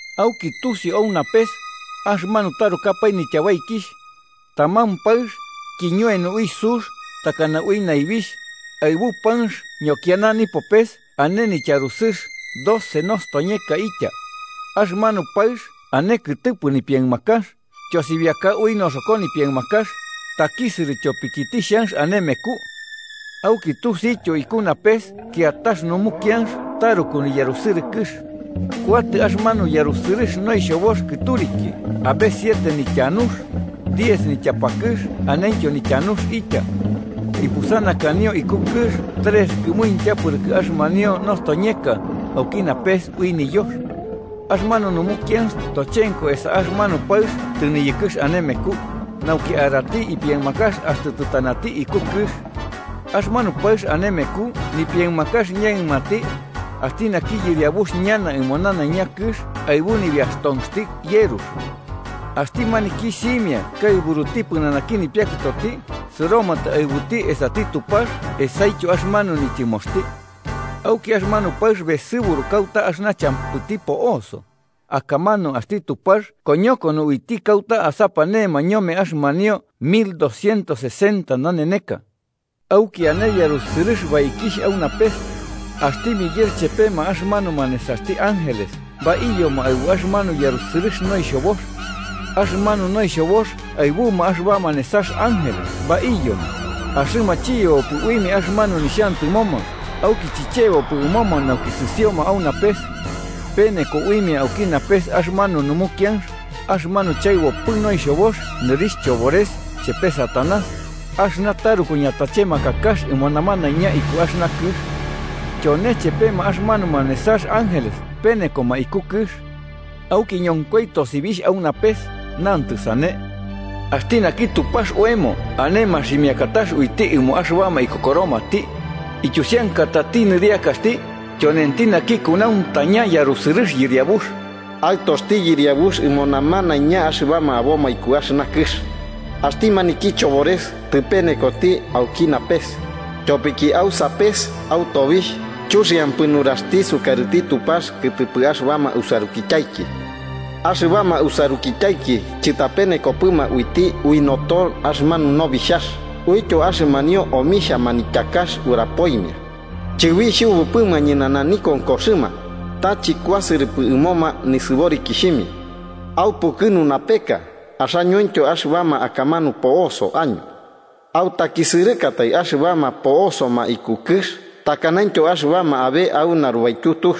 Auki tusiu au napes axɨmanu tarukapae nityabaikixh: taman paɨx kiñoeno ui sux takana ui naibixh, aɨbu panx ñokiana nipopes ane nityarusɨx doce nostoñeka itya. Axɨmanu paɨx ane kɨtɨpɨ nipiaɨmakax, tyosibiaka ui noxoko nipiaɨmakax, takisɨrɨ tyopiki tixhanx ane meku. Auki tusiuityo iku napes kiatax numukianx taruku niyarusɨrɨkɨx: kuatɨ axɨmanu yarusɨrɨx noixhobox kɨturiki abe siete nityanux, diez nityapakɨx anentyo nityanux itya. Ipusanakanio iku kɨx trex kɨmuintya pɨrɨkɨ axɨmanio nostoñeka auki napes ui niyox. Axɨmanu numukianx tochenko esa axɨmanu paɨx tɨniyɨkɨx ane meku, nauki arati ipiaɨmakax axtɨ tɨtanati iku kɨx. Axɨmanu paɨx ane meku nipiaɨmakax ñaɨmanti, axti naki yɨriabuxti ñana ɨmo nanaiña kɨx aɨbu nibiaxtonxti yerux. Axti maniki simia kaɨburuti pɨnanaki nipiakɨtoti sɨromatɨ aɨbuti esati Tupax esaityo axɨmanu nityɨmoxti. Auki axɨmanu paɨx besɨburu kauta axɨna champɨti po'oso, akamanu axti Tupax koñokono uiti kauta asapanema ñome axɨmanio mil doscientos sesenta naneneka. Auki ane yarusɨrɨx baikixh au napes: axti Miguel chepema axɨmanuma nesaxti ángeles baiyoma aɨbu axɨmanu yarusɨrɨx noixhobox. Axɨmanu noixhobox aɨbuma axɨbama nesax ángeles baiyoma, axɨma chiyebopɨ uimia axɨmanu nixhantɨmoma, auki chicheboikipɨ ɨmoma nauki sɨsioma au napes. Peneko uimia auki napes axɨmanu numukianx, axɨmanu chaɨbopɨ noixhobox nɨrixh Chobores chepe Satanás, axɨna taruku ñatachemakakax ɨmo namanaiña iku axɨna kɨx. Tyone chepema axɨmanuma nesax ángeles penekoma iku kɨx. Auki ñonkoi tosibixh au napes, nantɨ sane: “Axti naki Tupax oemo ane maximiakatax uiti ɨmo axɨbama ikokoromati. Ityusiankatati nɨriakaxti, tyonenti naki kunauntaña yarusɨrɨx yɨriabux. Aɨtoxti yɨriabux ɨmo namanaiña axɨbama aboma iku axɨna kɨx. Axti maniki chobores tɨpenekoti auki napes, tyopiki au sapes au tobixh, chuxiampɨ nuraxti sukarɨti Tupax kɨtɨpɨ axɨbama usarukityaiki. Axɨbama usarukityaiki chɨtapenekopɨma uiti ui noto axɨmanu Nobixhax uityo axɨmanio omixhia manityakax urapoimia. Chɨbixhubupɨma ñɨnana nikonkoxɨma, ta chɨkuasɨrɨpɨ ɨmoma nisɨborikixhimia. ¡Aupukɨnu, napeka, axañointyo axɨbama akamanu po'oso año! ¡Autakisɨrɨkatai axɨbama po'osoma iku kɨx takanaintyo axɨbama abe au narubaityu tux,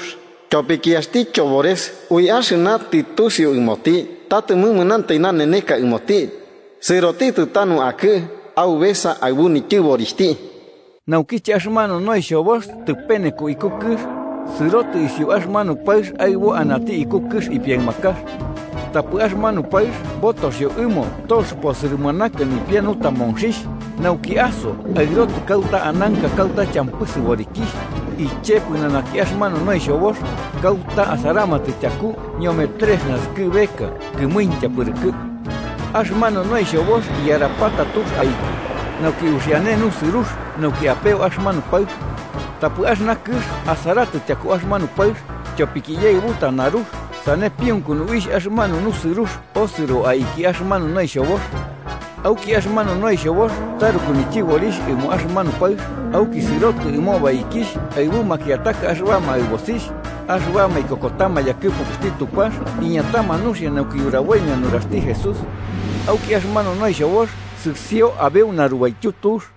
tyopiki axti chobores ui axɨna tɨtusiu ɨmoti ta tɨmɨmanantai naneneka ɨmoti, sɨrotitɨ tanu akɨ aubesa aɨbu nityɨborixhti!” Naukiche axɨmanu noixhobox tɨpeneko iku kɨx, sɨrotɨ isiu axɨmanu paɨx aɨbo anati iku kɨx ipiaɨmakax. Tapɨ axɨmanu paɨx botoxio ɨmo tox posɨrɨmanaka nipia nutamonxixh, nauki aso aɨrotɨ kauta ananka kauta champɨ sɨborikixh, iche pɨnanaki axɨmanu noixhobox, kauta asaramatɨ tyaku ñome trex naskɨbeka kɨmuintya pɨrɨkɨ. Axɨmanu noixhobox iyarapata tux aiki, nauki uxiane nusɨrux nauki apeo axɨmanu paɨx. Tapɨ axɨna kɨx asaratɨ tyaku axɨmanu paɨx, tyopiki iyaɨbuta narux sane piunkunu uixh axɨmanu nusɨrux osɨro aiki axɨmanu noixhobox. Auki axɨmanu noixhobox taruku nityɨborixh ɨmo axɨmanu paɨx, auki sɨrotɨ ɨmo baikixh aɨbu makiataka axɨbama aɨbosixh, axɨbama ikokotama yakɨpukuxti Tupax iñatama nuxia nauki uraboimia nuraxti Jesús. Auki axɨmanu noixhobox sɨsio abeu narubaityu tux.